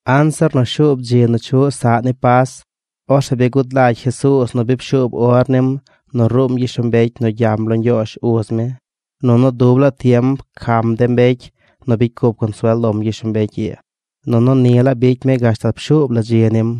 Anzir nu shuub dzi nu chuꞌ saꞌ ni Pas, orzeꞌ bi gud lagy Jesuuz nu bi pshuub or nim nu ruum gyishlombecy nu gyam lo Ñgyoozh uz mi. Nunu dub laa tiem pcam de mbecy nu bicy cup consuel lom gyishlombecy ii. Nunu ni laa bicy mi gashtal pshuub la dzi nim.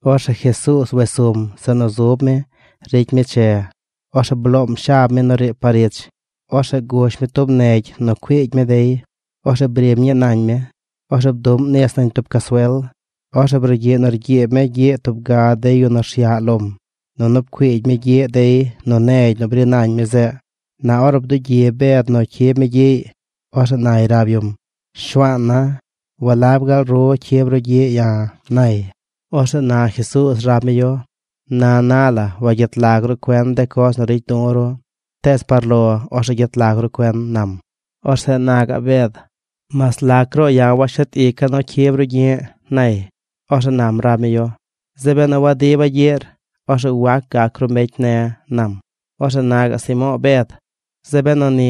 Orzeꞌ Jesuuz wes sum zeꞌ nu zub mi ricy mi che. Orzeꞌ bloom shab mi nu riib par ich. Orzeꞌ gush mi tub negy nu cuiigy mi dey. Orzeꞌ brim ñii nañ mi. Orzeꞌ bduꞌm nis nañ tub casuel. Orzeꞌ brugyiꞌ nu rgyiib mi gyiꞌ tub ga de yu nu rsyaꞌ lom, nunu pcuiigy mi gyiꞌ dey nu negy nu bri nañ mi zeꞌ. Na ornu bdugyi Bed nu cyib mi gyiꞌy, orzeꞌ nay rab yum: ―Shuaan na, ¿walab gaal ru cyib ru gyi̱ꞌ ya̱? ―nay. Orzeꞌ na Jesuuz rab mi yu: ―Na na la wagyet lag ru cuen de coz nu ricy du̱ ru, tees par lo, orzeꞌ gyet lag ru cuen ―nam. Orzeꞌ na gaꞌ Bed: ―¡Mas lac ruꞌ ya̱ washet ica̱ nu ru cyib ru gyi̱ꞌ! ―nay. Orzeꞌ nam rab mi yu: ―Zeꞌ benu wadiba̱ gyiꞌr, orzeꞌ wac gac ru mbecy ne̱ ―nam. Orzeꞌ na gaꞌ Simo̱o̱ Bed: ―¡Zeꞌ benu ni,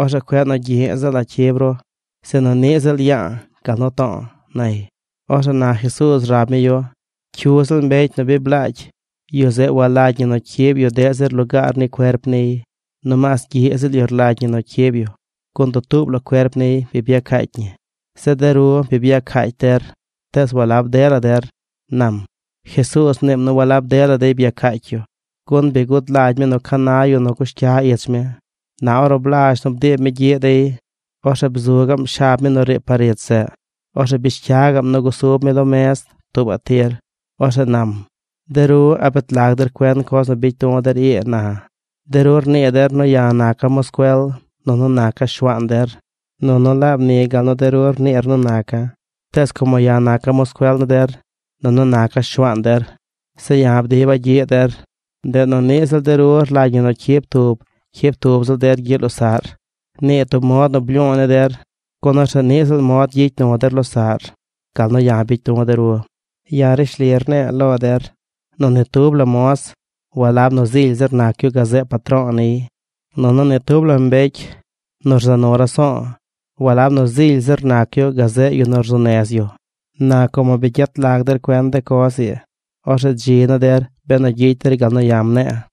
orzeꞌ cueꞌ nu gyiꞌ ziꞌla̱ cyib ru, sinu niꞌ ziꞌl ya̱a̱ gal nu to̱o̱! ―nay. Orzeꞌ na Jesuuz rab mi yu: ―Cyu ziꞌl mbecy nu bi blaagy, yu zeꞌ walagy ñi nu cyib yu deꞌ zir lugaar ni cuerp niy. No maas gyiꞌ ziꞌl yu rlagy ñi nu cyib yu, gun dutuub la cuerp niy bi byacaacy ñi. Zeꞌ de ru bi byacaacy der, tees walab dela der ―nam. Jesuuz mniim nu walab dela dey byacaacy yu, gun bi gud lagy mi nu ca na yu nu cush cya ich mi. Na ornu blazh nu bdiib mi gyiꞌ dey, orzeꞌ bzu gaꞌm shab mi nu riib par ich zeꞌ. Orzeꞌ bish cya gaꞌm nu gusub mi lo mez tuubaꞌ tir. Orzeꞌ nam: ―De ru, ¿a bet lag der cuen coz nu bicy du̱ der ii na? De ru rnii der nu ya̱ naca̱ moscuel nunu naca̱ Shuaan der. Nunu laab ni gal nu de ru rniir nu naca̱. Tees como ya̱ naca̱ moscuel ni der, nunu naca̱ Shuaan der, se ya̱ bdiba̱ gyiꞌ der, ndeꞌ nu niꞌ de ru rlagy ñi nu cyib tub, cyib tub ziꞌl der gyiꞌ losaꞌr. Nii tub mod nu blyu̱u̱ ni der, gun orzeꞌ niꞌ ziꞌl mod gyicy nu der losaꞌr: gal nu ya̱ bicy du̱ de ru. Ya̱ rishli rne̱e̱ lo der, nu ni tub la moz walab nu zily zir nac yu gazeꞌ patro̱o̱ niy. Nunu ni tub la mbecy nu rza nu raso̱o̱ walab nu zily zir nac yu gazeꞌ yu nu rzuu nez yu. Na como bi gyet lag der cuen de coz ii, orzeꞌ dzi ni der benu gyicy der gal nu ya̱ mne̱e̱.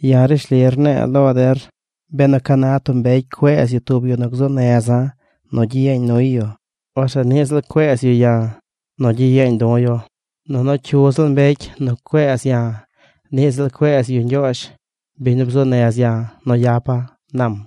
Ya̱ rishli rne̱e̱ lo der, benu ca na tub mbecy cueez yu tub yu nu gzuu neza̱ nu gyiyeeñ nuy yu, orzeꞌ niꞌ ziꞌl cueez yu ya̱ nu gyiyeeñ du̱ yu. Nunu cyu ziꞌl mbecy nu cueez ya̱, niꞌ ziꞌl cueez yu Ñgyoozh biñ nu bzuu nez ya̱ nu yapa̱ ―nam.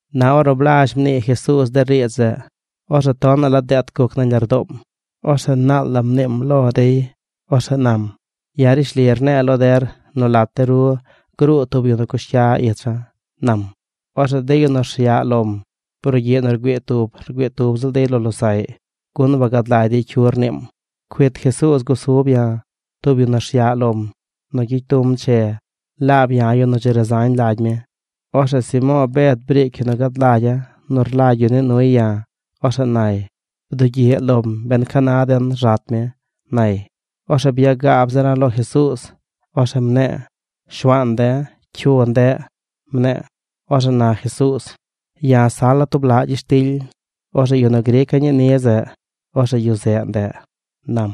Na ornu blazh mnii Jesuuz de riidz zeꞌ, orzeꞌ tonaꞌ la deet guc nañ lardoom. Orzeꞌ naal la mniim lo dey. Orzeꞌ nam: ―Ya̱ rishli ne̱e̱ lo der nu lat de ru gruu tub mbecy nu cush cya icha̱ ―nam. Orzeꞌ de yu nu rsyaꞌ lom, brugyiꞌ nu rgüii tub, rgüii tub ziꞌl dey lo losaꞌy, gun wagad lagy dey cyu rniim. Cuit Jesuuz gusub ya̱, tub yu rsyaꞌ lom, nu gyicy du̱m che. Laab ya̱ yu nu dzi razañ lagy mi. Orzeꞌ Simo̱o̱ Bed briic yu nu gad lagya̱ nu rlagy yu nii nuy ya̱. Orzeꞌ nay: ―Bdugyiꞌ lom ben ca na den rzat mi ―nay. Orzeꞌ byagaab zira̱ lo Jesuuz. Orzeꞌ mne̱e̱: ―Shuaan de̱, ¿cyu ndeꞌ? ―mne̱e̱. Orzeꞌ na Jesuuz: ―Ya̱ sala̱ tub laꞌ gyishtily. Orzeꞌ yu nu grica̱ ñii ni zeꞌ orzeꞌ yu zeꞌ ndeꞌ ―nam.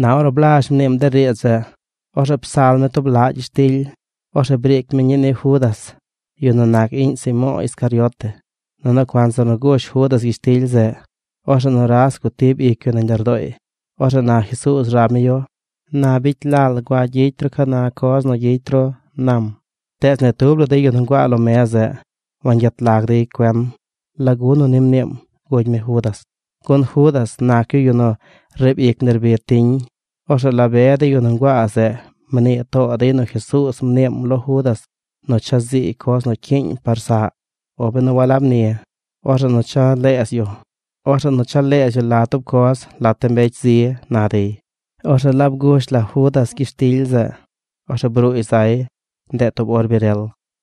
Na ornu blazh mniim de riidz zeꞌ, orzeꞌ psal mi tub laꞌ gyishtily. Orzeꞌ briic mi ñii ni Judas, yu nu nac iꞌñ Simo̱o̱ Iscariote. Nunu cuanzir gush Judas gyishtily zeꞌ, orzeꞌ nuras gutib ic yu nañ lardooy. Orzeꞌ na Jesuuz rab mi yu: ―Na bicy lal gua gyicy ru ca na coz nu gyicy ru ―nam. Tees ni tub la de yu nu nguaa lo mez zeꞌ wangyet lag dey cuen lagu nu ni mniim gugy mi Judas. Gun Judas nac yu yu nu riib ic nerbid tiñ. Orzeꞌ la be de yu nu nguaa zeꞌ mnii too dey nu Jesuuz mniim lo Judas nu cha ziiy coz nu cyiiñ par saꞌ. O benu walab ni, orzeꞌ nu cha leez yu la tub coz lat de mbecy zi, na dey. Orzeꞌ laab gush la Judas gyishtily zeꞌ. Orzeꞌ bruuy zay. Ndeꞌ tub or bi rel.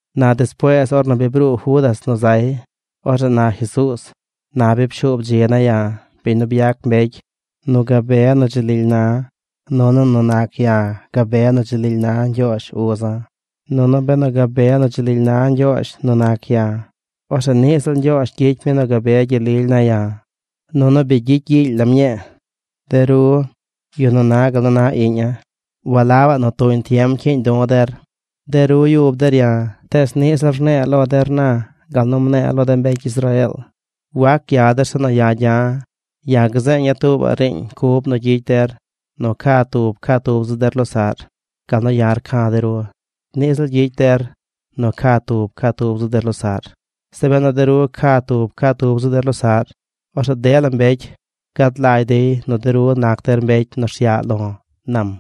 Na despuees ornu bi bruu Judas nu zay, orzeꞌ na Jesuuz: ―Na bi pshuub dzi ne̱ ya̱, biñ nu byac mbecy, nu gabe nu dzi lily na̱, nunu nu nac ya̱ gabe nu dzi lily na Ñgyoozh uza̱. Nunu benu gabe nu dzi lily na Ñgyoozh nu nac ya̱, orzeꞌ niꞌ ziꞌl Ñgyoozh gyicy mi nu gabe gyel lily ne̱ ya̱, nunu bi gyicy gyiily lam ñii. De ru, yu nu na gal nu na iꞌña̱, walabaꞌ nu tuñ tiem cyiiñ du̱ der. De ru yub der ya̱, tees niꞌ ziꞌl rne̱e̱ lo der na gal nu mne̱e̱ lo de mbecy Israeel: “Wac gya der zeꞌ nu ya̱ gya̱.” Ya̱ gzeeña̱ tuubaꞌ riiñ cub nu gyicy der: nu ca tub, ca tub ziꞌl der losaꞌr. Gal nu ya̱ rca̱ de ru, niꞌ ziꞌl gyicy der nu ca tub, ca tub ziꞌl der losaꞌr. Zeꞌ benu de ru ca tub, ca tub ziꞌl der losaꞌr, orzeꞌ dela mbecy gad lagy dey nu de ru nac der mbecy nu rsyaꞌ lo̱ ―nam.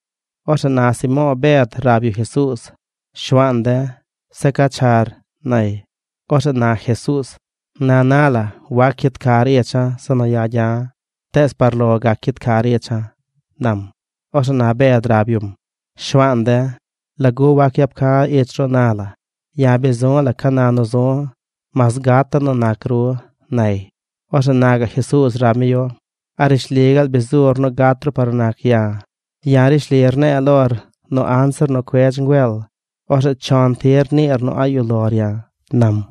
Orzeꞌ na Simo̱o̱ Bed rab yu Jesuuz: ―Shuaan de̱, ¿zeꞌ ca char? ―nay. Orzeꞌ na Jesuuz: ―Na na la wac cyid car icha̱ zeꞌ nu ya̱ gya̱. Tees par lo gac cyid car icha̱ ―nam. Orzeꞌ na Bed rab yum: ―Shuaan de̱, ¿lagu wac yap ca̱ ich ru na la? ¡Ya̱ bi zu̱ la̱ ca na nu zu̱, mas gata̱ nu nac ru! ―nay. Orzeꞌ na gaꞌ Jesuuz rab mi yu: ―¿A rishli gaal bi zur nu gat ru par nu nac ya̱? Ya̱ rishli rne̱e̱ lor nu anzir nu cuedz ngüel, orzeꞌ chon tir niir nu a̱ꞌ yuꞌ lor ya̱ ―nam.